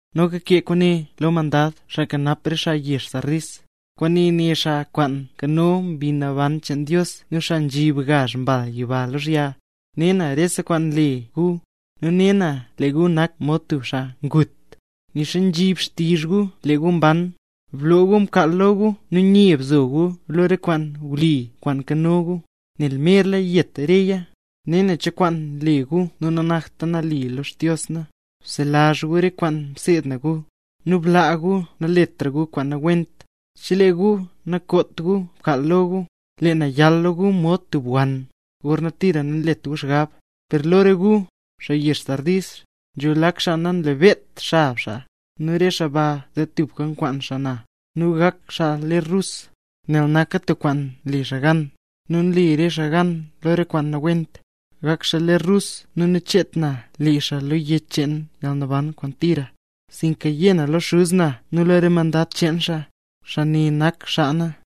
’Noka kee kwaane lo mandad, xaa nkanap re xaa na yezh Sardis: “Kwaane né xaa kwaan nkano gazh Mbi Naban cheen Dios nu xaa nzhib gazh mbal yiba lozhya: ‘Ne na rese kwaan nle gu, nu ne na lee gu nak mod tub xaa ngut, nixa nzhib xtizh gu lee gu mban. Bloo gu mkaal lo gu nu nye bzo gu lo re kwaan wli kwaan nkano gu, nel merla yet reya. Ne na cho kwaan nle gu nu nanakta nali lo Xdios na. Bselazh gu re kwaan mseed gu; nu blaa gu naletra gu kwaan nawent. Chelee gu nakoot gu mkaal lo gu, lee na yal lo gu mod tub wann, gorna tira nanlet gu xgab. Per lo re gu, xaa yezh Sardis, nzho lak xaa namlebeedt xab xaa, nu re xaa baa ze tubka kwaan na, nu gak xaa ler rus, nel naka tub kwaan mle xaa gan. Nu nle re xaa gan lo re kwaan nawent, gak xaa ler rus nu nacheet na le xaa lo yech cheen yalnaban kwaan tira, sinka yé na lo Xuz na nu lo re mandad cheen xaa, xaa ne nak xaa na.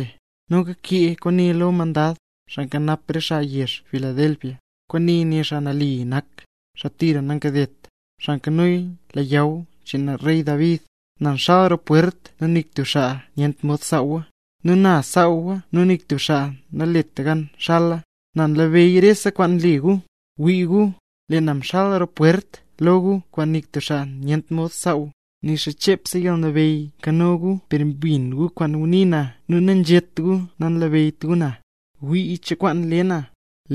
’Noka kee kwaane lo mandad, xaa nkanap re xaa na yezh Filadelfia: “Kwaane né xaa nali nak, xaa tira nankadet, xaa nkano leyaw cheen rey David: ‘Na nxal roo pwert nu nik tub xaa nyent mod saawa, nu na nsaawa nu nik tub xaa nalet gan xala. Na nlabeyy rese kwaan nle gu. Wii gu, lee na mxal roo pwert lo gu kwaan nik tub xaa nyent mod saaw. Nixa chepse yalnabeyy nkano gu, per mbin gu kwaan ngunii na nu nanzhét gu nanlabeyyt gu na. Gwii cho kwaan le na.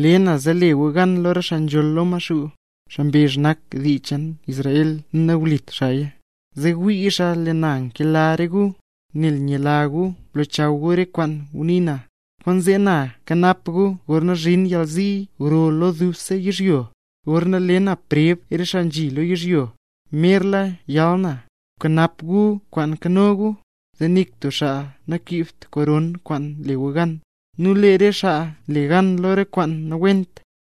Le na zee le gu gan lo re xaa nzholl lo Maxuu, xaa mbezh nak xaa dii cheen Israel nu nawlit xaaya, zee wii xaa lee na nkela re gu. Nel myela gu mlochaw gu re kwaan ngunii na, kwaanzee na kanap gu gorna zhin yalzi gro lo dubse yizhyo, gorna le na preb re xaa nzhi lo yizhyo. Merla yal na. Bkanap gu kwaan nkano gu, zee nik tub xaa nakiibt koron kwaan le gu gan. Nu lee re xaa nle gan lo re kwaan nawent,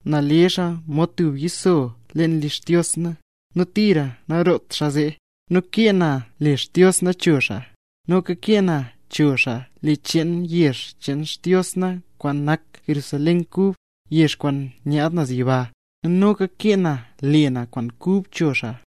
na le xaa mod tub yiso leen li Xdios na, nu tira naroot xaa zee. Nu kee na le Xdios na cho xaa; noka kee na cho xaa le cheen yezh cheen Xdios na kwaan nak Jerusalén Kub, yezh kwaan nyaad naz yiba; nu noka kee na le na kwaan kub cho xaa.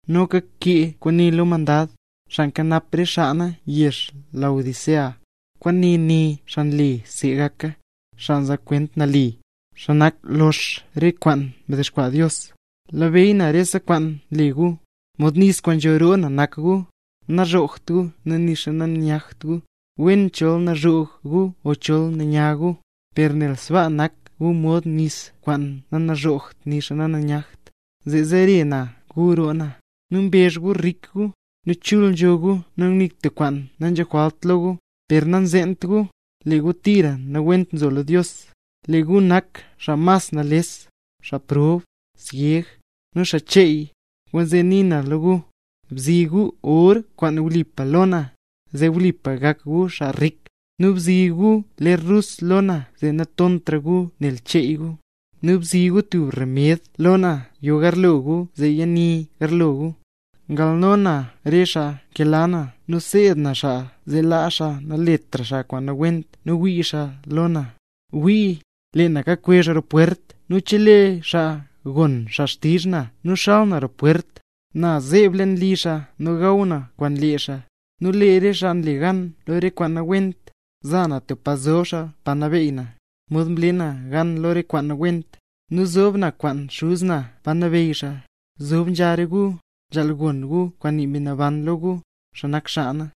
’Noka kee kwaane lo mandad, xaa nkanap re xaa na yezh Laodicea: “Kwaane né xaa nle zee gaka, xaa nzaa kwent nali, xaa nak lox re kwaan mdexkwaa Dios: ‘Nlabeyy na rese kwaan nle gu. Mod nis kwaan nzho roo na nak gu. Nazhoogt gu nu nixa nanyagt gu. ¡Wen chol nazhoog gu o chol nanyag gu! Per nel sbaa nak gu mod nis kwaan nanazhoogt nixa nananyagt, zee zere na gu roo na. Nu mbezh gu rik gu, nu chul nzho gu nu nik tub kwaan nanzho jwalt lo gu; per nanzeent gu, lee gu tira nawent nzo lo Dios. Lee gu nak xaa mas nales, xaa prob, syeg, nu xaa cheey. Kwaanzee nii na lo gu: Bzi gu or kwaan wlipa lo na, zee wlipa gak gu xaa rik; nu bzi gu ler rus lo na zee natontra gu nel cheey gu; nu bzi gu tub remed lo na yo garlo gu zee yani garlo gu. Ngalno na re xaa nkela na nu seed na xaa, zee laa xaa naletra xaa kwaan nawent nu wii xaa lo na. ¡Wii, lee na kakwezh roo pwert nu chelee tub xaa gon xtizh na nu xal xaa roo pwert, na zeeb leen li xaa nu gaw na kwaan lee xaa! Nu lee re xaa nle gan lo re kwaan nawent, za na tub pa zob xaa pa nabeey na, mod mle na gan lo re kwaan nawent, nu nzob na kwaan Xuz na pa nabeyy xaa. ¡Nzob nzha re gu, nzhaal gon gu kwaan nii Mbi Naban lo gu, xaa nak xaa na!’”